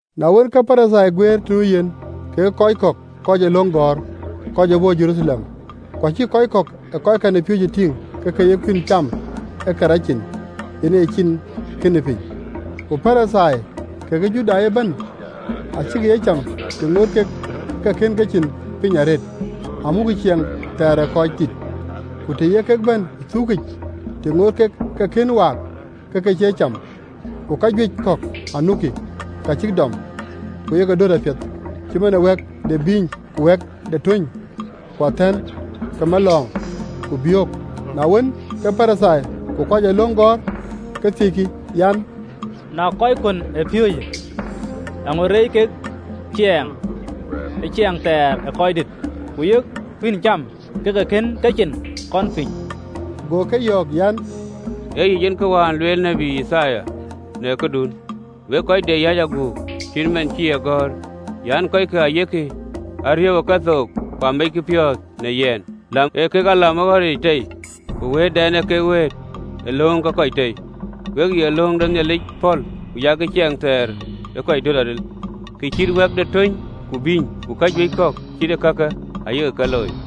Na wën, ke Parithai guëër të nu yen, kekë kɔc kɔ̈k kɔc ë löŋ gɔ̈ɔ̈r, kɔc ë bɔ̈ Jeruthalem. Ku acïk kɔc kɔ̈k ë kɔckɛn ë piööcë tïŋ ke ke ye kuïn cam ë ke rac cin, yen aye cin kënë piny. Ku Parithai, kekë Judai ëbɛ̈n, acïkï ye cam, të ŋoot kek ë ke kën kecin piny arëët, amukkï ciɛɛŋ thɛɛr ë röördït: ku të ye kek bɛ̈n ë thuukic, të ŋoot kek ë ke kën waak, ke ke cie cam: ku kajuëc kɔ̈k anukï, ka cïk dɔm, ku yek ke döt apiɛth, cït man ë wɛ̈k de abïïny, ku wɛ̈k de töny, ku abïïny ke malɔ̈ɔ̈ŋ, ku biök. Na wën, ke Parithai ku kɔc ee löŋ gɔ̈ɔ̈r ke thiëckï an, “Na kɔckuön ë piööcë, eeŋö reec kek cieŋ thɛɛr ë röördït, ku yek kuïn cam ke ke kën kecin piny?” (LXX). Go ke yɔ̈ɔ̈k an, “Ee yic en kë wään lueel tiët Yithaya në këdun, wek kɔc de yäc aguk, cït man cï ë gɔ̈ɔ̈r an, ‘Kɔckë ayek a riëëu ë kethook, Ku ameckï piɔ̈ɔ̈th në yɛn. Lam ee kek a lam ee ɣɔ̈ric tei, Ku wëëtdɛn ee kek wëët ee lööŋ ke kɔc tei!’ “We ye löŋ de Nhialic pɔ̈l, ku yak ciɛɛŋ thɛɛr ë kɔc döt aril, kë cït wɛ̈k de töny, ku abïny, ku kajuëc kɔ̈k cït ee kake ayak ke looi.”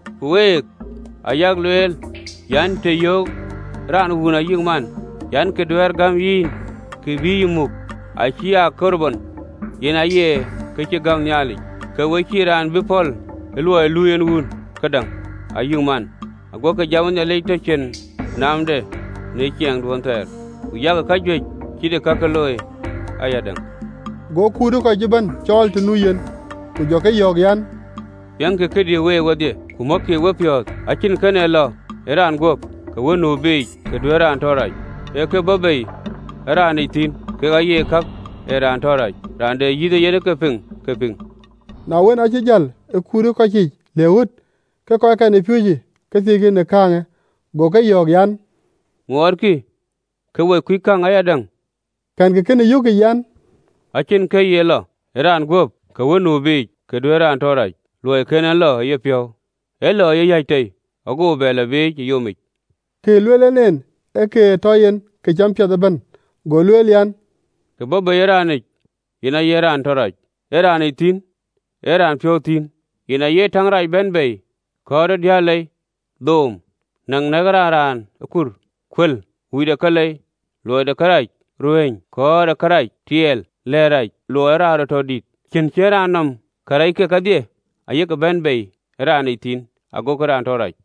Ku week ayak lueel an, Të yöökë raan wun ayï man an, Kë duɛ̈ɛ̈r gäm yïn, ke bï yï muk, ‘Acï aa Korban’ (yen aye, kë cï gäm Nhialic), ke we cïï raan be pɔ̈l ë luɔi lui en wun këdäŋ, ayï man. Aguɔkï jam ë Nhialic tɔ cïn naamde në ciɛɛŋduön thɛɛr: ku yak kajuëc cït ëkake looi ayadäŋ.” Go kut ë kɔc ëbɛ̈n cɔɔl të nu yen, ku jɔ ke yɔ̈ɔ̈k an, “Piɛŋkï këdï week wedhie, ku mɔ̈kkï wepiɔ̈ɔ̈th: acïn kën ee lɔ ë raan guöp, kë wën nu biic, kë duëër raan tɔ rac: ee ka bɔ̈ bei ë raanic thïn, kek aye kak ee raan tɔ rac.” Raan de yïth ee yen ke piŋ, ke piŋ! Na wën, aacï jäl ë kut ë kɔc yiic le ɣöt, ke kɔckɛn ë piööcë ke thiëckï në kääŋë. Go ke yɔ̈ɔ̈k an, “Ŋuɔɔtkï ke we kuc käŋ ayadäŋ? Kɛ̈nkï kënë yökic, an, Acïn kë ye lɔ ë raan guöp, kë wën nu biic, kë duëër raan tɔ rac: luɔi kën en lɔ ë yepiɔ̈u, alɔ ë yeyäc tei, go bɛ lɔ biic ë yomic?” (Kë ë lueel en en, ee kë ë tɔ yen këcam piɛth ëbɛ̈n.) Go lueel an, “Kë bɔ̈ bei ë raanic, yen aye raan tɔ rac. Ë raanic thïn, ë raan piɔ̈u thïn, yen aye täŋ rac bɛ̈n bei, kɔɔr ë diëër lei, dhööm, näŋ nɛ̈kë raan akur, kuël, wui de kalei, luɔi de kërac, ruëëny, kɔ̈ɔ̈r ë kërac, tiɛɛl, lɛ̈ɛ̈t rac, luɔi ee raan rɔt tɔ dït, cïn cïnë raan nɔm: Karɛckë kedhie ayek bɛ̈n bei ë raanic thïn, agokï raan tɔ rac.”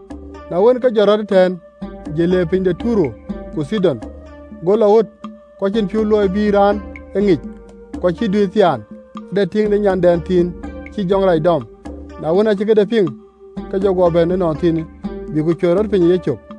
Na wën, ke jɔt rɔt ëtɛ̈ɛ̈n, jël le piny de Tayer ku Thidon. Go lɔ ɣöt, ku acïn piɔ̈u luɔi bï raan e ŋic, ku acïï duëër thiaan. Ade tiiŋ de nyandɛn thiin cïï jɔŋ rac dɔm: na wën, aacï këde piŋ, ke jɔ guɔ bɛ̈n ënɔnthiinë, bï ku cuɛt rɔt piny ë yecök.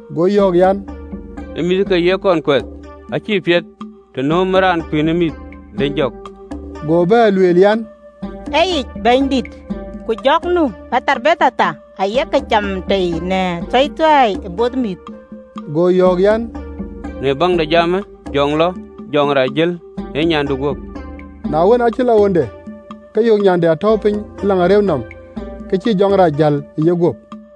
Go yɔ̈ɔ̈k an, “Ë mïth ë ke ye kɔn kuɛth, acï piɛth të nöömë raan kuïn ë mïth, dëny jɔ̈k.” Go bɛ̈ɛ̈r lueel an, “Ee yic Bɛ̈nydït, ku jɔ̈k nu ë paam thar ayek cam tei në athueithuei ë both mïth!” Go yɔ̈ɔ̈k an, “Në baŋ de jamë, jɔ lɔ, jɔŋ rac ë jäl ë nyandu guöp!” Na wën, aacï lɔ ɣönde, ke yök nyande atɔ̈u piny në agen nɔm, ke cïï jɔŋ rac jäl ë yeguöp.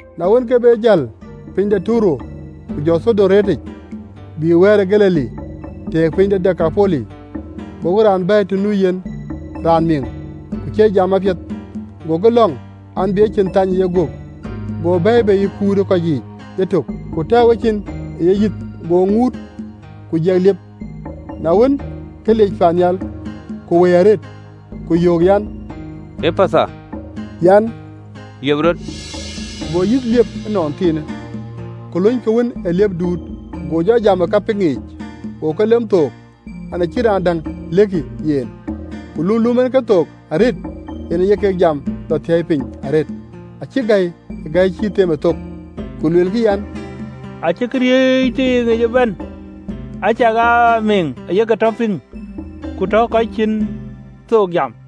Na wën, ke be jäl piny de Tayer, ku jɔ Thidon reetic, bïï Baar ë Galili, tëëk piny de Dekapoli. Gokï raan bɛ̈ɛ̈i të nu yen, raan miŋ, ku cie jam apiɛth, gokï lɔ̈ŋ an, bï ecin thany ë yeguöp. Go bɛ̈ɛ̈i bei ë kut ë kɔc yiic yetök, ku tɛ̈ɛ̈u ecin ë yeguöp, go ŋuut, ku jiɛk liep. Na wën, ke liec paannhial, ku wëi arëët, ku yöök an, “Epatha,” an, “Liep rɔt!” Go yïth liep ënɔnthiinë, ku lony ke wën ë liep guut, go jɔ jam ë ka piŋ yiic. Go ke lom thook an, Ë cïn raan däŋ lɛ̈kkï yen, ku lum lom en kethook arëët, yen aye kek jam lɔ thäi piny arëët. Acïk gäi ë gäi cïï themë thok, ku luelkï an, “Acï këriëëc tiiŋic ëbɛ̈n, acakaa mïŋ aye ke tɔ piŋ, ku tɔ kɔc cïn thook jam!”